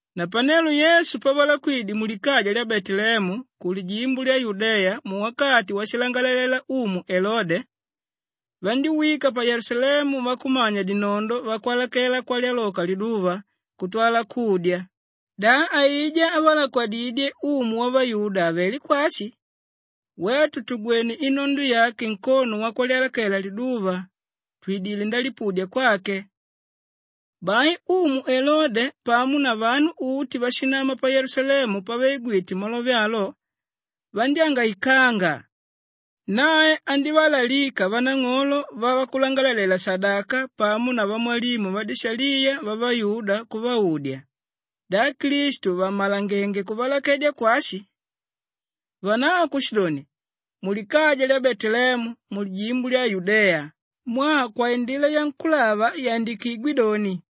Napanelo Yesu pavalakwadidye mulikaja lya Beteleemu kulijimbo lya Yudeya muwakati washilangalela Umu Elode, vandíwika pa Yelusalemu vakumanya-dinondo vakwalakela kwalyaloka liduva kutwala kudya, “Da aijá ávalakwadidye Umu Wavayuda avelé kwashi? Wetu tugwene inondo yake nkono wakwalyalakela liduva, twidilé ndalipudya kwake.” Bai Umu Elode pamo na vanu uti váshinama pa Yelusalemu pavaigwite malove alo, vandyángaikanga. Nae andívalalika vanang'olo vavakulangalalela-shadaka pamo na vamwalimu vadishaliya vavayuda kuvaudya, “Da Klistu vammalangenge kuvalakwedya kwashi?” Vanavo kushidoni, “Mulikaja lya Beteleemu mulijimbo lya Yudeya mwaa kwaindila yankúlava yandikigwé doni,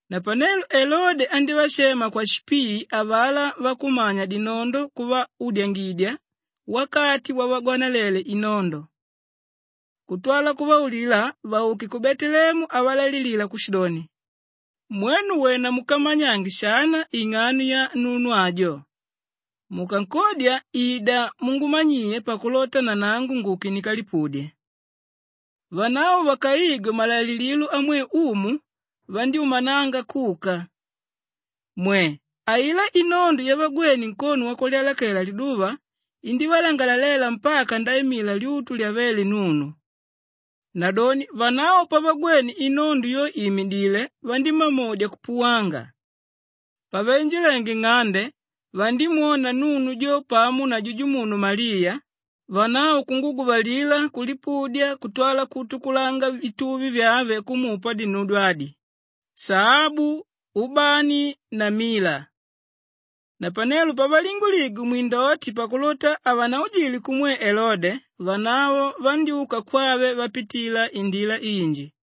Napanelo Elode andívashema kwashipii avalá vakumanya-dinondo kuvaudyangidya wakati wavagwanalele inondo kutwala kuvaulila vauke ku Beteleemu avalaililila kushidoni, “Mwenu wena mukamanyange shana ing'ano ya nunu ajo, mukankodya ida mungumanyiye pakulota nanangu nguke ndikalipudye.” Vanavo vakaigwe malaililo amwe umu, vandyúmananga kuka. Mwe! Ailá inondo yavagwéne nkono wakwalyalakela liduva indívalangalalela mpaka ndaimila lyutu lyavéle nunu. Nadoni vanavo pavagwene inondo yo ìmidile, vandímamodya kupuwanga. Pavainjilenge nng'ande vandímwona nunu jo pamo na jujumunu Maliya, vanavo kunguguvalila kulipudya kutwala kuutukulanga vituvi vyave kumupa dinudyo adi: shaabu, ubani na mila. Napanelo pavalinguligwe mwindoti pakulota havanaujile kumwe Elode, vanavo vandyúka kwave vapitila indila inji.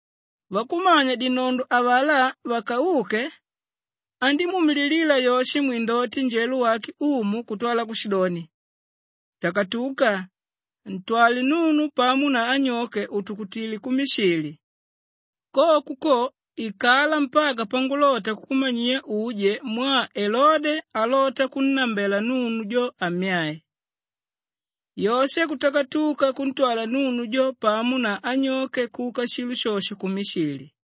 Vakumanya-dinondo avalá vakauke, andímuumililila Yoshe mwindoti njelo wake Umu kutwala kushidoni, “Takatuka! Ntwale nunu pamo na anyoke utukutile ku Mishili. Koko ko, ikala mpaka pangulota kukumanyiya uje mwaa Elode alota kunnambela nunu ammyae.” Yoshe kutakatuka kuntwala nunu jo pamo na anyoke kuma shilo shosho kuka ku Mishili.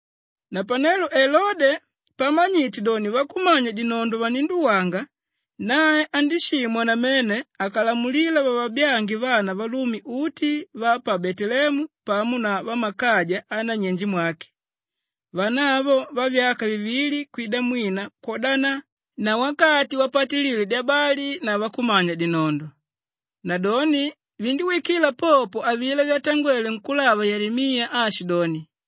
Napanelo Elode pamanyite doni vakumanya-dinondo vaninduwanga, nae andíshimwa namene akalamulila vavabyange vana valume uti va pa Beteleemu pamo na vammakaja anyenjemwake, vana avo vavyaka vivili kwida mwina kwodana na wakati wapatilile dyabali na vakumanya-dinondo. Nadoni vindíwikila popo avilá vyatangwéle nkúlava Yelemiya aashidoni,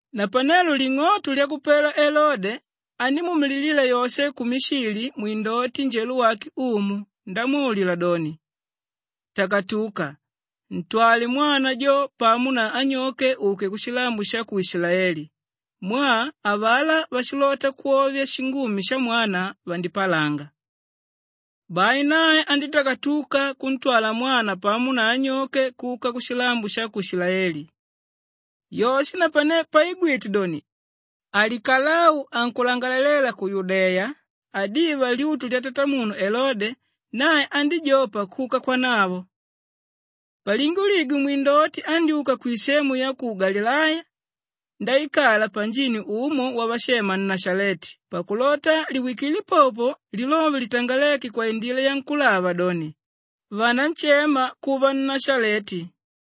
Napanelo ling'oto lyakupela Elode, andímuumililila Yoshe ku Mishili mwindoti njelo wake Umu ndamwaulila doni, “Takatuka, ntwale mwana jo pamo na anyoke uke kushilambo sha ku Ishilaeli mwaa avalá váshilota kwovya shingumi shamwana, vandipalanga.” Bai nae andítakatuka kuntwala mwana pamo na anyoke kuka kushilambo sha ku Ishilaeli. Yoshe napane paigwite doni Alikalau ankulangalalela ku Yudeya adiva lyutu lyatatamunu Elode, nae andíjopa kuka kwanavo. Palinguligwe mwindoti andyúka kwisemu ya ku Galileya ndaikala panjini umo wavashema Nashaleti pakulota liwikile popo lilove litangaléke kwaindila yavakulava doni, “Vananshema kuva Nnashaleti.”